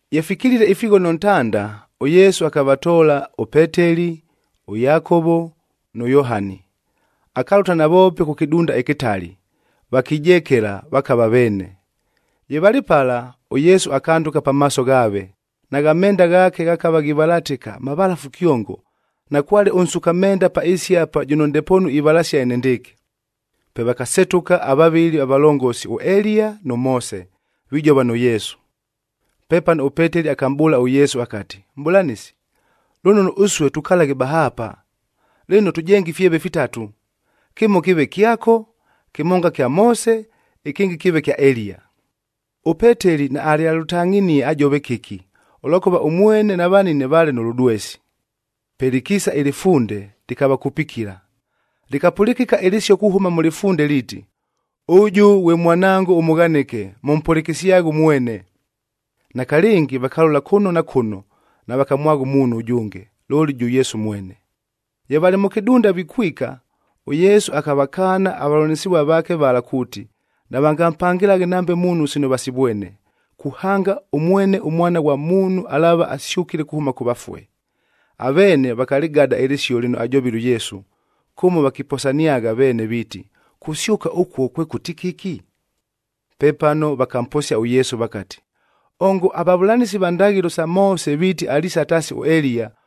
Ye fikilile ifighono ntanda, ʉYesu akavatoola ʉPeteli, ʉYakovo nʉ Yohani. Akalʉta navoope kʉ kɨdunda ɨkɨtali, vakijekela, vakava veene. Ye valɨ pala, ʉYesu akandʉka pamaaso ghaave, nagha menda ghaake ghakava ghivalatɨka, mavalafu kyongo, nakwale ʉnsuka menda pa ɨɨsi apa, jʉno ndepoonu ivalasia enendɨɨkɨ. Pe vakasetʉka avavɨli avalongosi ʉEliya nʉ Moose, vijova nʉ Yesu. Pepano ʉPeteli akamʼbʉʉla ʉYesu akati, “Mʼbʉlanɨsi, lʉnono ʉsue tukalaghe bahaapa. Lɨno, tʉjenge ifyeve fitatu: kɨmo kɨɨve kyako, kɨmonga kya Moose, ɨkɨngɨ kɨɨve kya Eliya.” ɄPeteli naalyalʉtangʼhinie ajove kɨki, ʉlwakʉva ʉmwene na vanine vaale nʉ lʉdwesi. Pe lɨkiisa ɨlɨfunde lɨkavakupikila, lɨkapʉlɨkɨka ɨlɨsio kuhʉma mʉ lɨfunde liiti, “Ʉjʉ ghwe Mwanango ʉmʉghanɨke, mʉmpʉlɨkɨsyaghe ʉmwene!” Nakalɨngi vakalola kʉno na kʉno navakamwagha ʉmuunhu ʉjʉnge, looli jʉ Yesu mwene. Ye valɨ mʉ kɨdunda vikwika, ʉYesu akavakaana avavʉlanɨsɨvua vaake vala kuuti, navangampangɨlaghe nambe muunhu sino vasivwene, kuhanga ʉmwene ʉMwana ghwa Muunhu alaava asyʉkile kuhʉma kʉ vafue. Aveene vakalɨgada ɨlɨsio lɨno ajovile ʉYesu, kʉmo vakiposaniagha veene viiti, “Kusyʉka ʉkuo kwekʉti kɨki?” Pepano vakamposia ʉYesu vakati, “Ongo avavʉlanɨsi va ndaghɨlo sa Moose viiti aliisa taasi ʉEliya,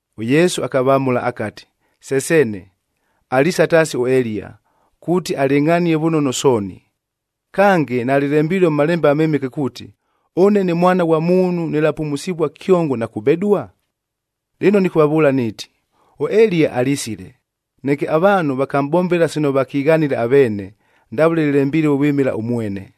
ɄYesu akavamʉla akati, “Se seene, aliisa taasi ʉEliya, kuuti alɨngʼhanie vʉnono sooni. Kange, nalɨlembilue mʉ Malembe aMɨmɨke kuuti, ʉne ne Mwana ghwa Muunhu nɨlapumusivua kyongo na kubedua? Lɨno nɨkʉvavʉʉla niiti, ʉEliya alisile,b neke avaanhu vakamʼbombela sino vakighanile aveene, ndavʉle lɨlembilue vwɨmɨla ʉmwene.”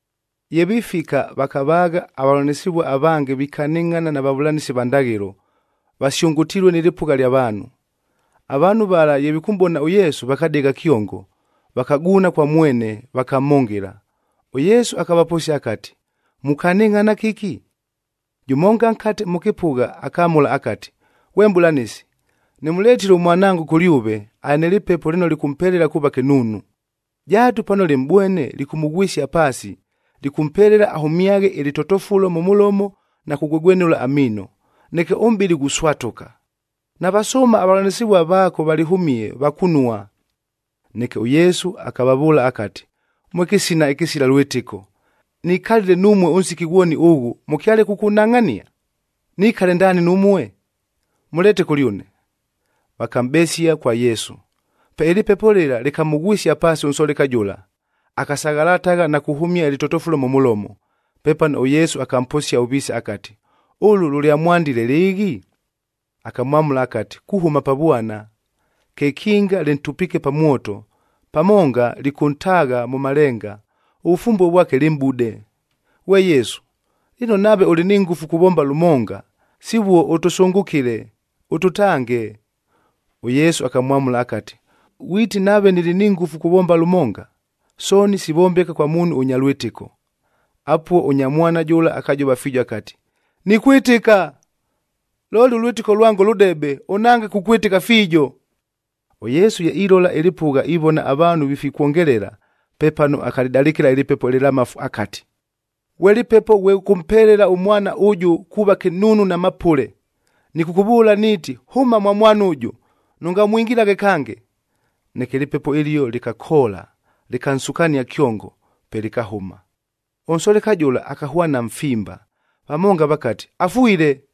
Ye vifika, vakavaagha avavʉlanɨsɨvua avange vikanɨngʼhana na vavʉlanɨsi va ndaghɨlo, vasyʉngʉtilue nɨ lɨpʉgha ɨlya vaanhu. Avaanhu vala ye vikʉmʼbona ʉYesu, vakadegha kyongo, vakaguuna kwa mwene, vakamhʉngɨla. ɄYesu akavaposia akati, “Mukanɨngʼhana kɨki?” Jʉmonga nkate mʉ kɨpʉgha, akamʉla akati, “Ghwe Mʼbʉlanɨsi, nɨmʉletile ʉmwanango kʉlyʉve, alɨ nɨ lɨpepo lɨno lɨkʉmpelela kuuva kɨnuunu. Jaatu pano lɨmʼbwene lɨkʉmʉghwɨsia paasi, lɨkʉmpelela ahʉmyaghe ɨlɨtotofulo mʉ mʉlomo na kugwegwenʉla amiino, neke ʉmʼbɨlɨ ghuswatʉka. Navasʉʉma avavʉlanɨsɨvua vaako valɨhʉmie, vakunua.” Neke ʉYesu akavavʉʉla akati, “Mwe kɨsina ɨkɨsila lwɨtɨko! Nikalile numue ʉnsiki ghwoni ʉghʉ, mʉkyale kʉkʉnhangʼhania? Nikale ndaani numue? Mʉleete kʉlyʉne!” Vakamʼbesia kwa Yesu. Pe ɨlɨpepo lɨla lɨkamʉghwɨsia paasi ʉnsoleka jʉla, akasaghalatagha na kuhʉmia ɨlɨtotofulo mʉ mʉlomo. Pepano ʉYesu akamposia ʉviise akati, “Ʉlʉ lʉlyamwandile lɨɨghi?” Akamwamʉla akati, “Kuhʉma pa vwana. Kekinga lɨntupiike pa mwoto, pamonga lɨkʉntaagha mʉ malenga, ʉvʉfumbue vwake lɨmʼbude. Ghwe Yesu, lɨno nave ʉlɨ ni ngʉfu kuvomba lʉmonga, sivuo ʉtʉsʉngʉkɨle, ʉtʉtange.” ɄYesu akamwamʉla akati, “Ghwiti nave nɨlɨ ni ngʉfu kuvomba lʉmonga! Sooni sivombeka kwa muunhu ʉnya lwɨtɨko.” Apuo ʉnya mwana jʉla akajova fiijo akati, “Nikwɨtɨka! Looli ʉlwɨtɨko lwango lʉdebe, ʉnhange kukwɨtɨka fiijo.” ɄYesu ye ilola ɨlɨpʉgha ivona avaanhu vifikwongelela, pepano akalɨdalɨkɨla ɨlɨpepo ɨlɨlamafu akati, “Ghwe lɨpepo ghwe ʉkʉmpelela ʉmwana ʉjʉ kuuva kɨnuunu na mapʉle, nɨkʉkʉvʉʉla niiti, hʉma mwa mwana ʉjʉ, nʉngamwingilaghe kange!” Neke ɨlɨpepo ɨlio lɨkakoola, lɨkansukania kyongo, pe lɨkahʉma. Ʉnsoleka jʉla akahwana mfimba, vamonga vakati, “Afwile!”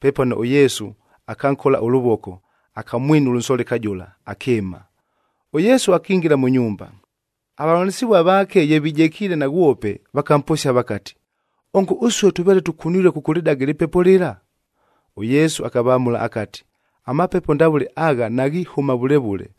Pepano ʉYesu akankola ʉlʉvoko, akamwinula ʉnsoleka jʉla, akɨɨma. ɄYesu akingila mʉ nyumba, avavʉlanɨsɨvua vaake ye vijekiile naghwope, vakamposia vakati, “Ongo ʉsue tʉveele tʉkunilue kʉkʉlɨdaga ɨlɨpepo lɨla?” ɄYesu akavamʉla akati, “Amapepo ndavʉle agha naghihʉma vʉle vʉle,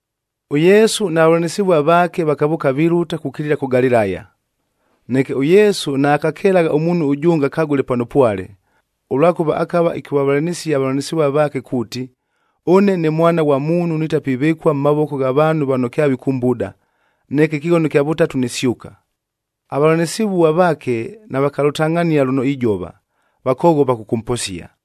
ɄYesu na vavʉlanɨsɨvua vaake, vakavʉʉka vilʉta kukilila kʉ Galilaya. Neke ʉYesu naakakelagha ʉmuunhu ʉjʉnge akagʉle pano pwale, ʉlwakʉva akava ɨkʉvavʉlanɨsia avavʉlanɨsɨvua vaake kuuti, “Ʉne ne Mwana ghwa Muunhu nitapivɨkua mʉ mavoko gha vaanhu vano kyavikʉmbuda, neke ɨkɨghono ɨkya vʉtatu nisyʉka.” Avavʉlanɨsɨvua vaake navakalʉtangʼhania lʉno ijova, vakoghopa kʉkʉmposia.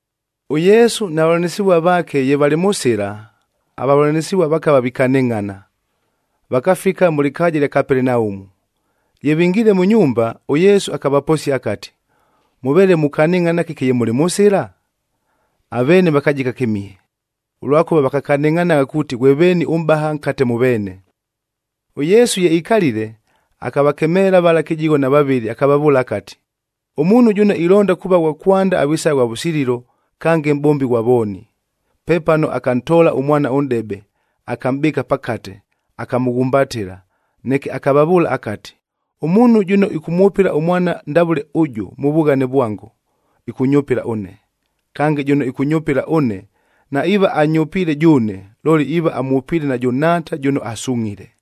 ɄYesu na vavʉlanɨsɨvua vaake ye valɨ mʉ sɨla, avavʉlanɨsɨvua vakava vikanɨngʼhana. Vakafika mʉ lɨkaaja ɨlya Kapelenaumu. Ye vingiile mʉ nyumba, ʉYesu akavaposia akati, “Mʉveele mukanɨngʼhana kɨki ye mʉlɨ mʉ sɨla?” Aveene vakajika kɨmihe, ʉlwakʉva vakakanɨngʼhanagha kuuti ghwe veeni ʉmʼbaha nkate mʉ veene. ɄYesu ye ikalile, akavakemeela vala kɨjigho na vavɨlɨ akavavʉʉla akati, “Ʉmuunhu jʉno ilonda kuuva ghwa kwanda avisaghe ghwa vʉsililo, kange mʼbombi ghwa vooni.” Pepano akantoola ʉmwana ʉnʼdebe, akamʼbɨɨka pakate, akamʉghumbatɨla, neke akavavʉʉla akati, “Ʉmuunhu jʉno ɨkʉmwʉpɨla ʉmwana ndavʉle ʉjʉ mʉ vughane vwango, ɨkʉnyʉpɨla ʉne. Kange, jʉno ɨkʉnyʉpɨla ʉne, naiiva anyʉpiile jʉʉne, looli iiva amwʉpiile najʉ Nhaata jʉno asungʼhile.”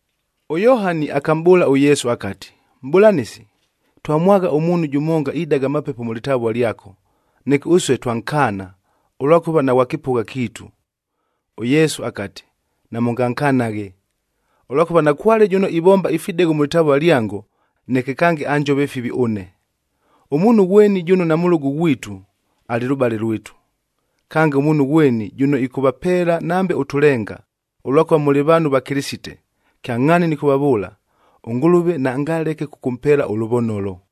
ɄYohani akamʼbʉʉla ʉYesu akati, “Mʼbʉlanɨsi, twamwagha ʉmuunhu jʉmonga idaga amapepo mʉ lɨtavua lyako, neke ʉsue twankaana, ʉlwakʉva naghwa kɨpʉgha kiitu.” ɄYesu akati, “Namʉngankanaghe, ʉlwakʉva nakwale jʉno ivomba ifidegho mʉ lɨtavua lyango, neke kange anjove fivi ʉne. Ʉmuunhu ghweni jʉno namʉlʉgʉ ghwitu, alɨ lʉbale lwitu. Kange, ʉmuunhu ghweni jʉno ɨkʉvapeela nambe ʉtʉlenga, ʉlwakʉva mʉlɨ vaanhu va Kɨlɨsite, kyangʼhaani nɨkʉvavʉʉla, ʉNgʉlʉve naangaleke kʉkʉmpeela ʉlʉvonolo.”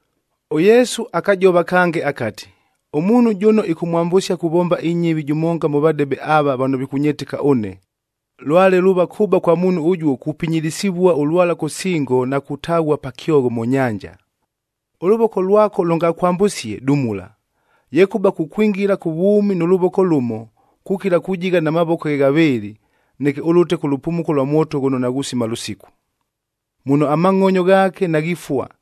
ɄYesu akajova kange akati, “Ʉmuunhu jʉno ɨkʉmwambʉsia kuvomba inyɨvi jʉmonga mʉ vadebe ava vano vikʉnyɨtɨka ʉne, lwale luuva kʉba kwa muunhu ʉjuo kupinyilisivua ʉlwala kʉ singo na kutaghua pa kyogho mʉ nyanja. Ʉlʉvoko lwako lʉngakwambʉsie, dumula. Yekʉba kukwingila kʉ vwʉmi nʉ lʉvoko lʉmo, kukila kujigha na mavoko ghe ghavɨɨlɨ, neke ʉlʉte kʉ lʉpumuko lwa mwoto ghʉno naghusima lʉsiku. Muno amangʼonyo ghaake naghifua,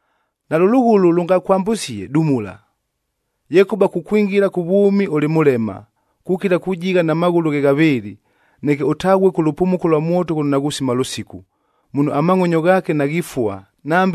Nalʉ lʉghʉlʉ lʉngakwambʉsie, dumula. Yekʉba kukwingila kʉ vwʉmi ʉlɨ mʉlema, kukila kujigha na maghʉlʉ ghe ghavɨɨlɨ, neke ʉtaghue kʉ lʉpumuko lwa mwoto ghʉno naghusima lʉsiku. Muno amangʼonyo ghaake naghifua,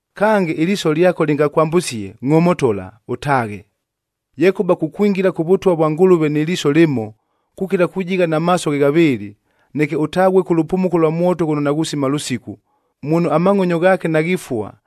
Kange, ɨliiso lyako lɨngakwambʉsie, ngʼomotola, ʉtaaghe. Yekʉba kukwingila kʉ Vʉtwa vwa Ngʉlʉve nɨ liiso lɨmo, kukila kujigha na maaso ghe ghavɨɨlɨ, neke ʉtaghue kʉ lʉpumuko lwa mwoto ghʉno naghusima lʉsiku, muno, ‘Amangʼonyo ghaake naghifua,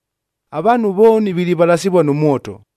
“Avaanhu vooni vilivalasivua nʉ mwoto,g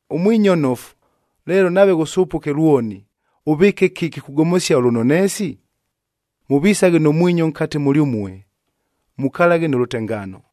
Ʉmwinyo nnofu, leelo nave ghʉsʉpʉke lwoni, ʉvɨɨke kɨki kugomosia ʉlʉnoneesi? Mʉvisaghe nʉ mwinyo nkate mʉlyʉmue, mukalaghe nʉ lʉtengaano.”